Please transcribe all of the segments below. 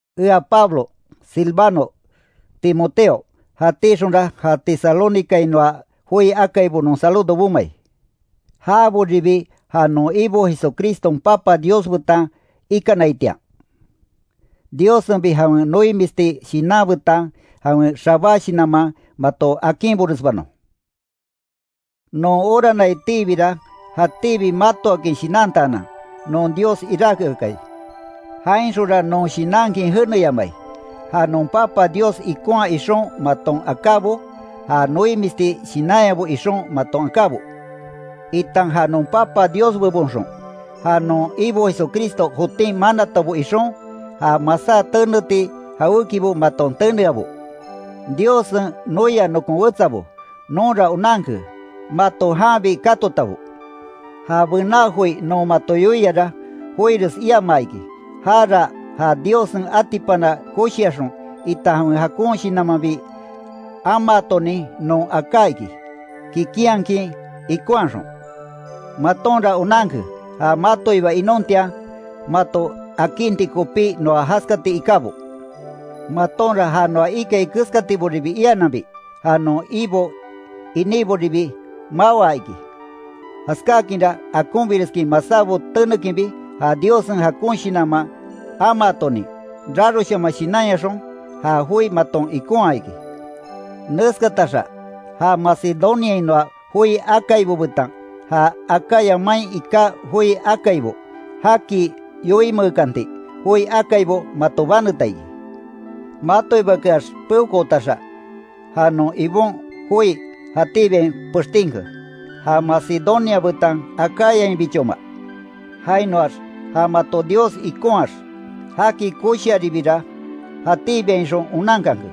Ea Pablo, Silvano, Timoteo, jatíxonra ja Tesalónicainoa joi akaibo non saludo bomai. Jaboribi ja non Ibo Jesucriston Papa Dios betan ikanaitian, Diossenbi jawen noimisti shinan betan jawen xabá shinanman mato akinboresbanon. Non oranaitiibira, jatíbi matoakin shinantaanan, non Dios iráke akai. Jainxonra non shinankin jeneyamai, ja non Papa Dios ikonhaa ixon maton akábo, ja noimisti shinanyabo ixon maton akábo, itan ja non Papa Dios bebonxon, ja non Ibo Jesucristo jotin manatabo ixon, ja masá teneti jawékibo maton teneabo. Diossen noia nokon wetsabo, nonra onanke, mato janbi katotabo. Ja bená joi non mato yoiara, joires iamaa iki. Jara ja Diossen atipana koshiaxon, itan jawen jakon Shinanmanbi amaatonin non aká iki, kikinhakin ikonhaxon. Matonra onanke ja matoiba inontian, mato akinti kopí noa jaskati ikábo. Matonra ja noa ikai keskatiboribi iananbi, ja non Ibo iníboribi mawaa iki, jaskáakinra akonbireskin masábo tenekinbi ja Diossen jakon Shinanman amaatonin, raroshaman shinanyaxon, ja joi maton ikonha iki. Neskataxa ja Macedoniainoa joi akaibo betan, ja Acaya main iká joi akaibo, jaki yoinmeekanti joi akaibo mato baneta iki. Matoibakeax peokootaxa, ja non Ibon joi jatíbiain pextinke. Ja Macedonia betan Acayainbichoma. Jainoax ja mato Dios ikonhaax, jaki koshiaribira jatíbiainxon onankanke.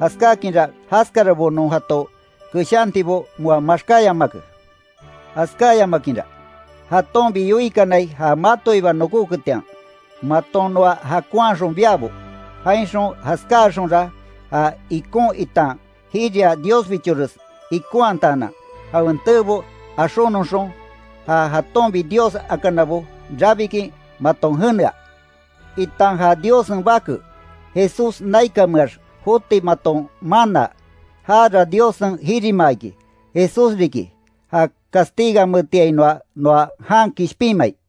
Jaskáakinra jaskarabo non jato keshantibo moa maxkáyamake. Jaskáyamakinra, jatonbi yoikanai ja matoiba nokóketian, maton noa jakonhaxon biabo; jainxon jaskáaxonra, ja ikon itan jiria Diosbichores ikonhataanan jawen teebo axónnoxon, ja jatonbi dios akanabo rabikin maton jenea, itan ja Diossen Bake, Jesús naikanmeax joti maton mánaa, jara Diossen jirimaa iki, Jesús riki ja castigameetiainoa noa jan kishpinmai.